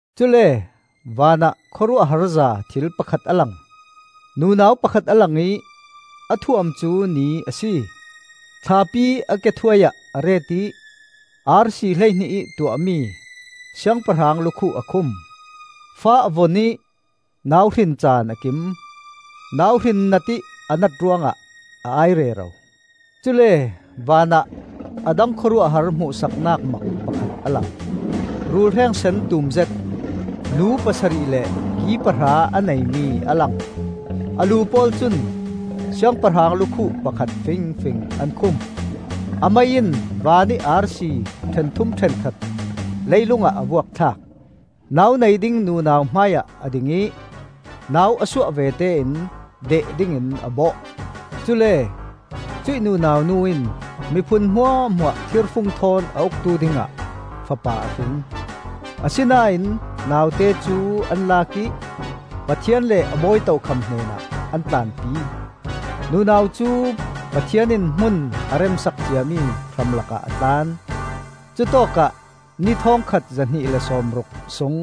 Cule vanah khawruahharza thil pakhat a lang. Nunau pakhat a lang ih a thuam cu ni a si; thlapi a ke thuaiah a ret ih arsi hleihnih ih tuahmi siangpahrang lukhuh a khum. Fa a vun ih nau hrin caan a kim. Nauhrin natih a nat ruangah a ai rero. Cule vanah a dang khawruahhar hmuhsaknak mak pakhat a lang. Rulhreng sen tumzet, lu pasarih le ki pahra a neimi a lang. A lu pawl cun siangpahrang lukhuh pakhat fingfing an khum. A mei in vanih arsi ṭhenthum ṭhenkhat leilungah a vuak thlak. Nau nei ding nunau hmaiah a ding ih nau a suah vete in deh dingin a bawh. Cule cuih nunau nu in miphun hmuahhmuah thirfung thawn a uktu dingah fapa a hring. Asinain naute cu an lak ih Pathian le a bawi tokham hnenah an tlanpi. Nunau cu Pathian in hmun a remsak ciami hramlakah a tlan. Cutawkah ni thawngkhat zahnih le sawmruk sung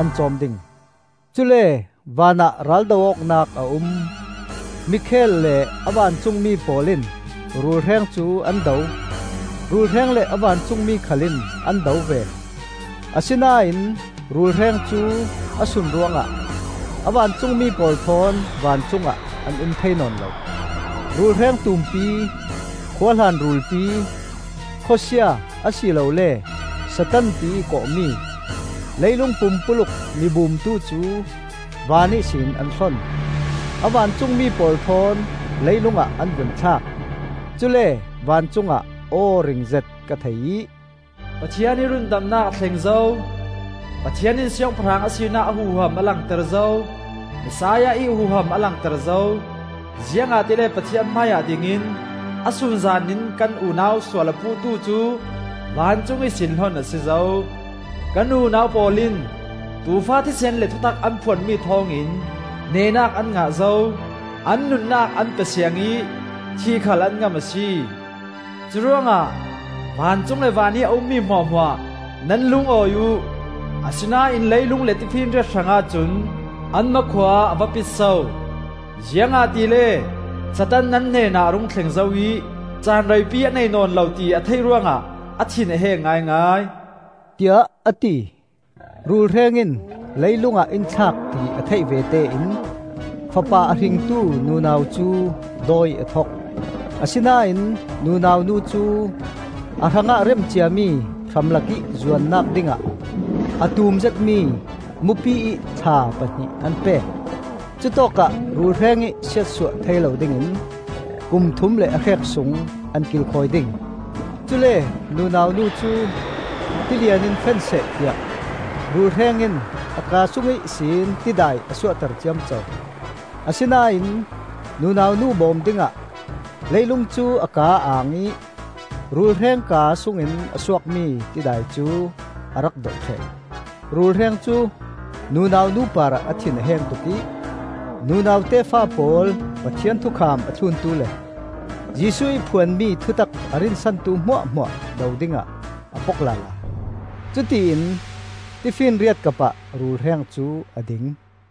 an cawm ding. Cule vanah raldo awknak a um. Mikhael le a vancungmi pawl in rulhreng cu an do; rulhreng le a vancungmi khal in an do ve. Asinain rulhreng cu a sun ruangah a vancungmi pawl thawn vancungah an um thei nawn lo. Rulhreng tumpi, khuahlan rulpi, Khawsia a si lole Satan tiih kawh mi, leilung pumpuluk mibumtu cu van ihsin an hlon. A vancungmi pawl thawn leilungah an vun thlak. Cule vancungah aw ringzet ka thei ih, “Pathian ih rundamnak a thleng zo! Pathian in siangpahrang a sinak a huham a langter zo! Messiah ih huham a langter zo! Ziangahtile Pathian hmaiah dingin, a sunzan in kan unau sual a puhtu cu vancung ihsin hlon a si zo. Kan unau pawl in Tuufa thisen le thutak an phuanmi thawngin nehnak an ngah zo. An nunnak an pe siang ih thih khal an ngam a si. Curuangah vancung le vanih a ummi hmuahhmuah nan lungawi uh! Asinain leilung le tifinriat hrangah cun an hmakhua a va pit so! Ziangahtile Satan nan hnen a rung thleng zo ih, Caan reipi a nei nawn lo ti a theih ruangah a thin a heng ngaingai,” tiah a ti. Rulhreng in leilungah in thlak ti a theih vete in fapa a hringtu nunau cu dawi a thok. Asinain nunau nu cu a hrangah rem ciami hramlakih zuannak dingah a tum zetmi mupiih thla pahnih an pek. Cutawkah rulhrengih siatsuah thei lo dingin kum thum le a hrek sung an kilkhawi ding. Cule nunau nu cu tilian in fenseh tiah rulhreng in a kaa sung ihsin tidai a suahter ciamco. Asinain nunau nu bawm dingah leilung cu a kaa a ang ih rulhreng kaa sungin a suakmi tidai cu a rak dolh ṭheh. Rulhreng cu nunau nu parah a thin a heng tuk ih nunau tefa pawl Pathian thukham a thluntu le Jesuh ih phuanmi thutak a rinsantu hmuahhmuah do dingah a pok lala. Cutiin tifinriat kapah rulhreng cu a ding.